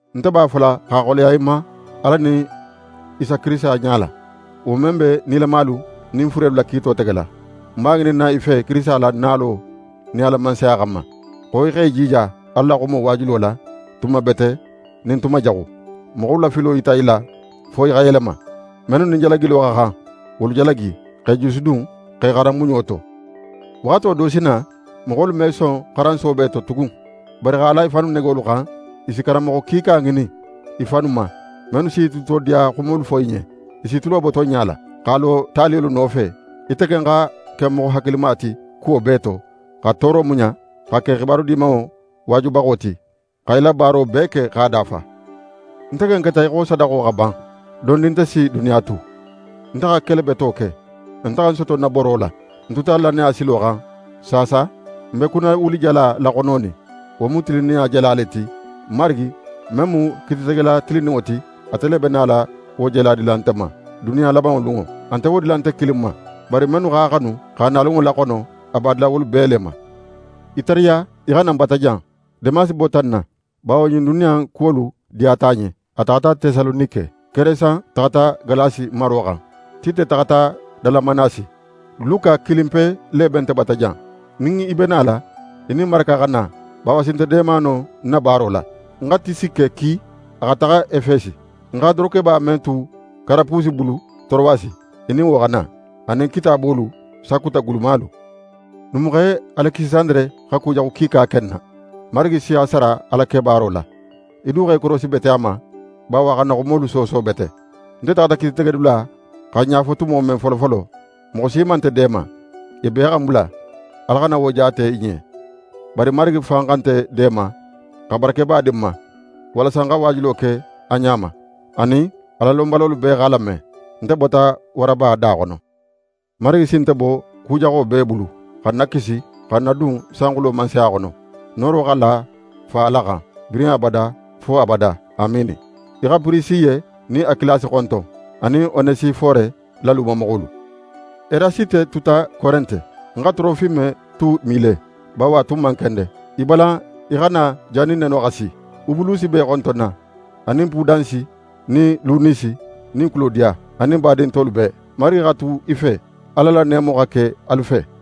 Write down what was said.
Nte b'a fola x'a xoleya í ma Ala nin Isa Kirisita ɲala, wo men be nilamalu nin furelu la kiito tegela, ń b'a ŋininna í fe Kirisita la nalo nin a la Mansaya xanma, xo í x'é jija Ala la xumo waajulo la, tuma bete nin tuma jaxu. Moxolu la filo yita i la fo i xa yelema. Mennu nin jalagilo xa xan, wolu jalagi, x'e jusudun, x'e xaran muɲo to. Waxato do si na, moxolu me son xaran soobe to tugun, bari x'a la i fannu negolu xan, i si karanmoxo kiika ŋinin i fannu ma, mennu s'i tulutodiya xumolu fo i ɲen. I s'i tulo bo tonɲa la, x'a lo taliyolu nofe. Ite ken xa ke moxo hakilima ti kuwo bee to, xa tooro muɲa, xa ke xibaru Dimanŋo waajubaxo ti, xa í la baaro bee ke x'a dafa. Nte ken keta í xo sadaxo xa ban. Dondin, nte si duniya tu. Nte xa kele beto ke. Nte xa ń soto ń na boro la. Ń tuta lannaya silo xan. Saasa, ń be kunnawulijala laxononin. Wo mu tilinninɲa jala le ti. Marigi, men mu kiititegela tilinninŋo ti, ate le be nala wo jala dila nte ma duniya labanŋo lunŋo. A nte wo dila nte kilin ma; bari mennu x'a xanu x'a nalunŋo laxono, a b'a dila wolu bee le ma. Í tariya í xa na ń bata jan. Demasi bota ń na, bawo ɲin duniya in kuwolu diyata a ɲen. A taxata Tesalonike. Keresan taxata Galasi maro xan. Tite taxata Dalamanasi. Luka kilinpe le be nte bata jan. Nin í be nala, í nin Maraka xa na, bawo a si nte deema no ń na baaro la. Ń xa Tisike ki a xa taxa Efesi. Ń xa dorokeba men tu Karapusi bulu Torowasi, í nin wo xa na, a nin kitaabolu, sakuta gulumalu. Numuxe Alekisandere xa ku jaxu kiika ke ń na. Marigi si a sara a la kebaaro la. Í du x'é korosi bete a ma, bawo a xa n na xumolu sooso bete. Nte taxata kiititegedula xa ń ɲafo tumo men folofolo, moxo si man nte deema. I bee xa ń bula. Ala xana wo jaate i ɲen. Bari Marigi xa nte deema, xa barakeba di ń ma, walasa ń xa waajulo ke a ɲa ma, anin, Alalonbalolu bee x'a lame. Nte bota waraba da xono. Marigi si nte bo ku jaxo bee bulu, xa ń nakisi, xa ń nadun sanxulo Mansaya xono. Nooro xa la Fa Ala xan, birin abada, fo abada. Amiini. Í xa Pirisiye nin Akilasi xonton, anin Onesifore la lumamoxolu. Erasite tuta Korente. Ń xa Torofime tu Mile, bawo a tun man kende. Í balan í xa na jannin neno xa si. Ubulusi b'é xontonna, anin Pudansi nin Linusi nin Kulodiya anin badin tolu bee. Marigi xa tu í fe. Ala la neemo xa ke alu fe.